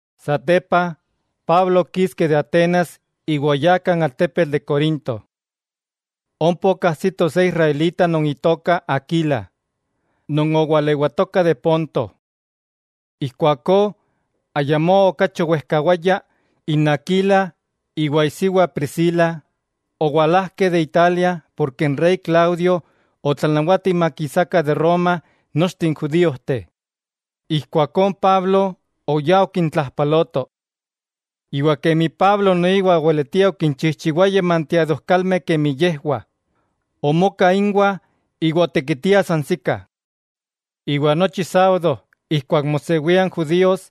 Satepa, Pablo okiski de Atenas iwa oyá kan altepetl de Corinto. Ompa okajsito se israelita non itoka Aquila, non owalewatoka de Ponto. Ijkuakó ayamó okachi owejkawaya, n Aquila iwa isiwa Priscila owalajkeh de Italia porke n rey Claudio otlanawati makisakah de Roma nochteh n judíojteh. Ijkuakó n Pablo oyá okintlajpaloto. Iwa kemi Pablo noiwa oweletia okinchijchiwaya manteadojkalmeh kemi yejwah, omoka inwah iwa otekitiah sansikah. Iwa nochi sábado ijkuak mosewia n judíos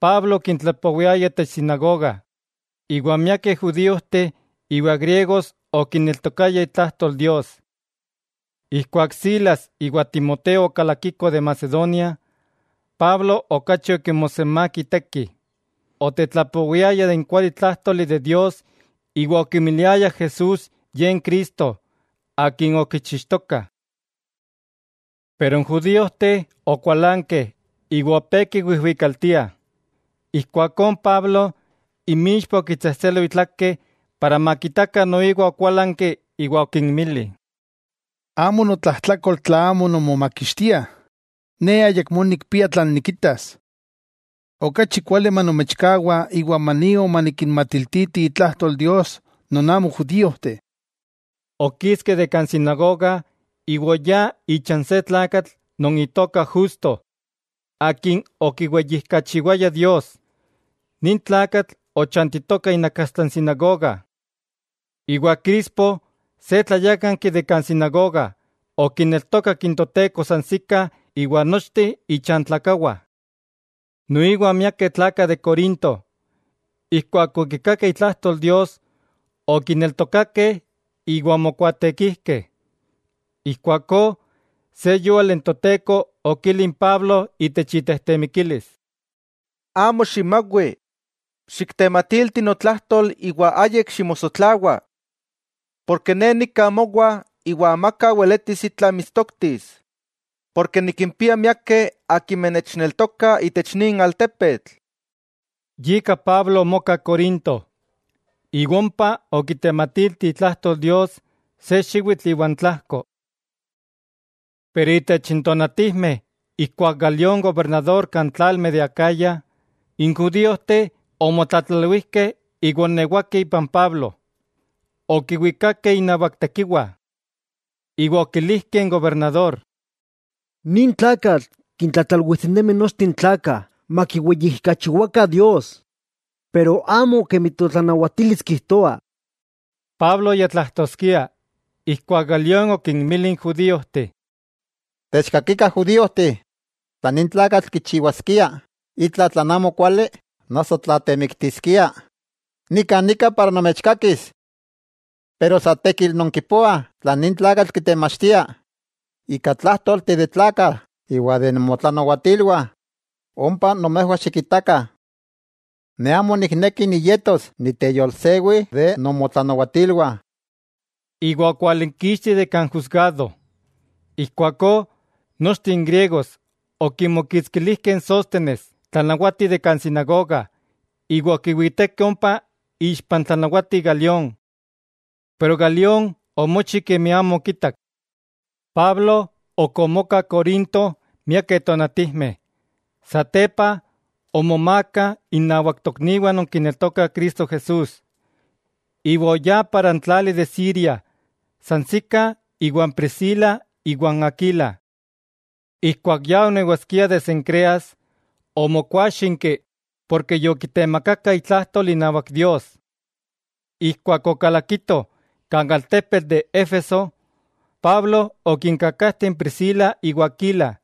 Pablo okintlapowiayah itech sinagoga, iwa miakeh judíojteh iwa griegos okineltokayah itlajtol Dios. Ijkuak Silas iwa Timoteo okalakikoh de Macedonia, Pablo okachi okimosenmák iteki; otetlapowiaya de n kualitlájtoli de Dios iwa okimiliaya Jesús Ye n Cristo akin okichixtokah. Pero n judíojteh okualankeh iwa opé kiwijwikaltiah, ijkuakó n Pablo inmixpa okitsejtselo itlake para makitakah noiwa okualanki iwa okinmili: —Amo notlajtlakol tla amo nonmomakixtiah; ne ayakmó nikpia tlan nikitas. Okachi kuali manomechkawa iwa manio manikinmatiltiti itlajtol Dios non amo judíojteh. Okiski de kan sinagoga iwa oyá icha n se tlakatl non itoka Justo, ye okiweyijkachiwaya Dios. Nin tlakatl ochantitoka inakastla n sinagoga. Iwa Crispo, se tlayákanki itech sinagoga, okineltokak n Toteko sansikah iwa nochteh ichantlakawah. Noiwa miakeh tlakah de Corinto, ijkuak okikakeh itlajtol Dios, okineltokakeh iwa omokuaatekijkeh. Ijkuakó, se yúali n Toteko okili n Pablo itech itejtemikilis: —Amo ximawi, xiktematilti notlajtol iwa ayik ximosotlawa. Porke Ne nika mowa iwa amaka weletis itla mitstoktis, porke nikimpia miakeh akimeh nechneltokah itech nin altepetl. Yika Pablo omoka Corinto, iwa ompa okitematilti itlajtol Dios se xiwitl iwa n tlajko. Pero itech n tonatijmeh ijkuak Galión gobernador kan tlalmeh de Acaya, n judíojteh omotlatlalwijkeh iwa oonewakeh ipan Pablo. Okiwikakeh inawak tekiwa, iwa okilijkeh n gobernador: —Nin tlakatl kintlatlalwijtinemi nochteh n tlakah makiweyijkachiwakah Dios, pero amo kemi totlanawatilis kijtoa. Pablo ya tlajtoskia, ijkuak Galión okinmili n judíojteh: —Techkakikah judíojteh, tla nin tlakatl kichiwaskia itla tlan amokuali noso tla temiktiskia, nika nika para nomechkakis. Pero san tekil nonkipoah tlan nin tlakatl kitemachtia, ika tlájtolteh de tlakah iwa de nomotlanawatilwah, ompa nomejwah xikitakah. Ne amo nikneki niyetos niteyolsewi itech nomotlanawatilwah. Iwa okwalinkixti de kan jusgado. Ijkuakó nochteh n griegos okimokitskilijkeh n Sóstenes, tlanawati itech sinagoga, iwa okiwitekeh ompa ixpa n tlanawati Galión. Pero Galión omochi kemi amo okitak. Pablo ok omoka Corinto miakeh tonatijmeh. Satepa omomaaka innawak tokniwah non kineltokah Cristo Jesús, iwa oyá kan tlali de Siria sansikah iwan Priscila iwa n Aquila. Ijkuak ya onewaskia de Cencreas, omokúaxinki porke yokitemakaka itlajtol inawak Dios. Ijkuak okalakitoh kan altepetl de Éfeso, Pablo okinkajteh n Priscila iwa Aquila,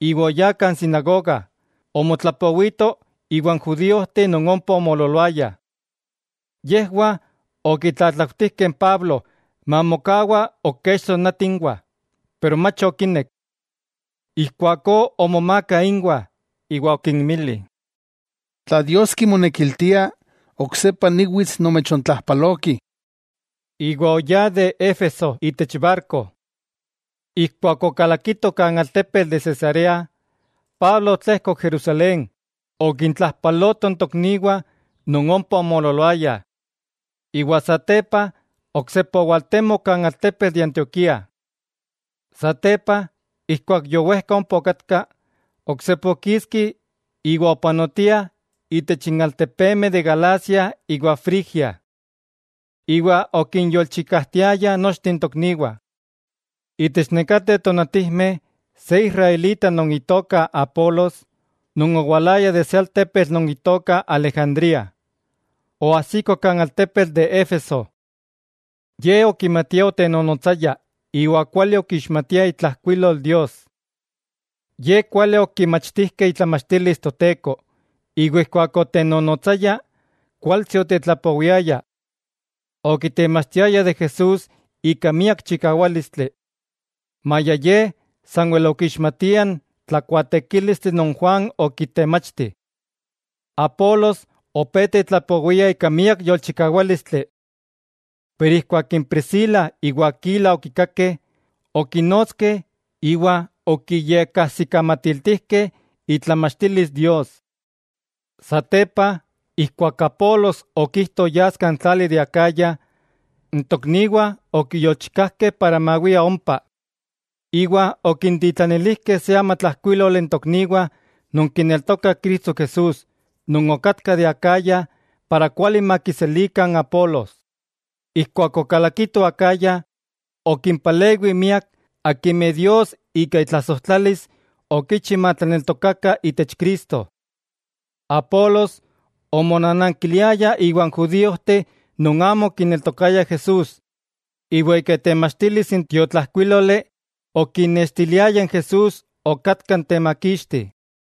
iwa oyá kan sinagoga, omotlapowito iwan judíojteh non ompa omoololoayah. Yejwah okitlatlautijkeh n Pablo mamokawa ok kech tonati inwah, pero mach okinek. Ijkuakó omomaaka inwah iwa okinmili: —Tla Dios kimonekiltia, oksepa niwits nomechontlajpaloki. Iwa oyá de Éfeso itech barko. Ijkuak okalakito kan altepetl de Cesarea, Pablo otlejkok Jerusalén okintlajpaloto n tokniwah non ompa omoololoayah, iwa satepa oksepa owaltemok kan altepetl de Antioquía. Satepa ijkuak yowejka ompa okatka, oksepa okiski iwa opapanotia itech n altepemeh de Galacia iwa Frigia. Iwa okinyolchikajtiaya nochteh n tokniwah. Itech nekateh tonatijmeh se israelita non itoka Apolos, non owalaya de se altepetl non itoka Alejandría, oajsiko kan altepetl de Éfeso. Ye okimatia otenonotsaya iwa kuali okixmatia itlajkuilol Dios. Ye kuali okimachtijkeh itlamachtilis Toteko, iwa ijkuak otenonotsaya, kualtsi otetlapowiaya. Okitemachtiaya de Jesús ika miak chikawálistli, maya ye sanwel okixmatia n tlakuaatekílistli non Juan okitemachti. Apolos opé tetlapowia ika miak yolchikawálistli. Pero ijkuak n Priscila iwa Aquila okikakeh, okinotskeh iwa okiyekajsikamatiltijkeh itlamachtilis Dios. Satepa ijkuak Apolos okijto yas kan tlali de Acaya, n tokniwah okiyolchikajkeh mawia ompa, iwa okintitlanilijkeh se amatlajkuíloli n tokniwah non kineltokah Cristo Jesús non okatkah de Acaya para kuali makiselikah n Apolos. Ijkuak okalakito Acaya, okimpalewi miak akimeh Dios ika itlasojtlalis okichi matlaneltokakah itech Cristo. Apolos omonanankiliaya iwan judíojteh non amo okineltokaya Jesús, iwa ika itemachtilis n tiotlajkuíloli okinnextiliaya Jesús okatka n temakixti.